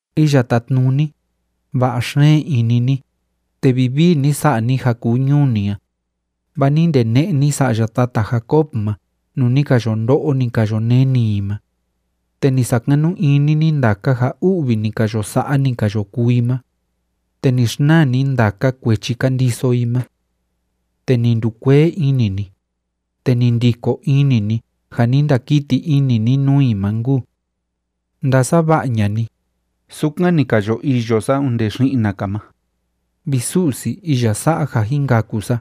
Iya Tátnuni, va'a xeen ini ni, te vivii ni sa'a ni ja kuu ñuu ni a, vaa ni ndene'e ni sa'ya tata Jacob ma nuu ni ka yo ndo'o, ni ka yo neni i ma. Te ni sakanu ini ni ndaka ja u'vi ni ka yo sa'a, ni ka yo kuu i ma, te ni xnaa ni ndaka kuechi ka ndiso i ma. Te ni ndukuee ini ni, te ni ndiko ini ni ja ni ndakiti ini ni nuu i ma nkuu. Ndasava'a ña'a ni, sukan ni ka yo iyo sa onde xi'na‑ka ma, vi Su'si iya sa'a ja jin kaku sa,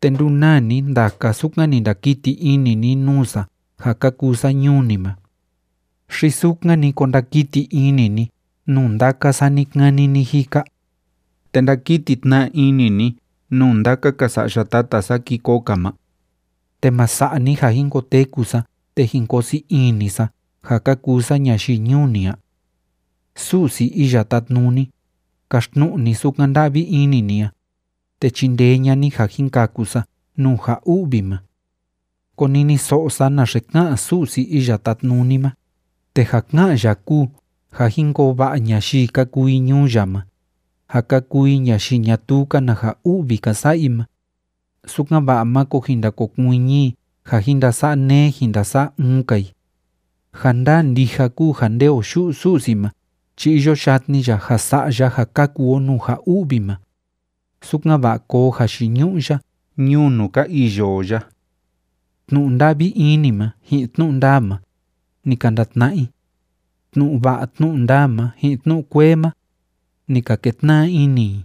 te ndunaa ni ndaka sukan ni ndakiti ini ni nuu sa ja ka kuu sa ñuu ni ma. ¿Xi sukan‑ni ko ndakiti ini ni nuu ndaka sa ni‑kani ni‑jika? ¿Te ndakiti tna ini ni nuu ndaka‑ka sa'ya tata sa ki koo‑ka ma? ¿Te ma sa'a ni ja jin koteku sa te jin ko sii ini sa ja ka kuu sa ñayii ñuu ni a? Su'si Iya Tátnuni, kaxtnu'u ni sukan nda'vi ini ni a, te chindee ña'a ni ja jin kaku sa nuu ja u'vi ma. Koniniso'o sa naxe ka'an Su'si Iya Tátnuni ma, te ja ká'an ya kúu ja jin koo va'a ñayii ka kuu i ñuu ya ma ja ka kuu i ñayii ñatuu‑ka na ja u'vi ka sa'a i ma, sukan‑va'a máko jin ndakokuiñi i ja jin ndasa'a neé jin ndasa'a uun‑ka i. Ja ndaa ndija kúu ja nde o yu'u Su'si ma chi iyo yatni ya ja sa'a ya ja kaku o nuu ja u'vi ma, sukan‑va'a koo jayiñu'u ya ñuu nuu ka iyo o ya. Tnu'u nda'vi ini ma ji'in tnu'u ndaa ma, ni ka ndatna'a i. Tnu'u va'a tnu'u ndaa ma ji'in tnu'u kuee ma, ni ka ketna'a ini i.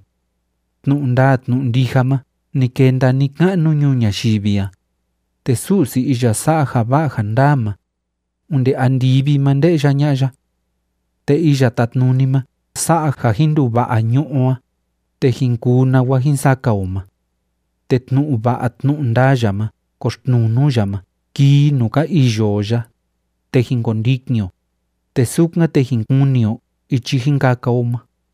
Tnu'u ndaa tnu'u ndija ma ni kenda ni‑ka'nu ñuu ñayivi a, te Su'si iya sa'a ja va'a ja ndaa ma, onde andivi ma nde'ya ña'a ya. Te Iya Tátnuni ma sa'a ja jin nduva'a ñu'ú o a, te jin kuu nawa jin saka o ma. Te tnu'u va'a tnu'u ndaa ya ma koxtnuu nuu ya ma kii i nuu ka iyo o ya, te jin kondikin o, te sukan, te jin kuni o ichi jin kaka o ma.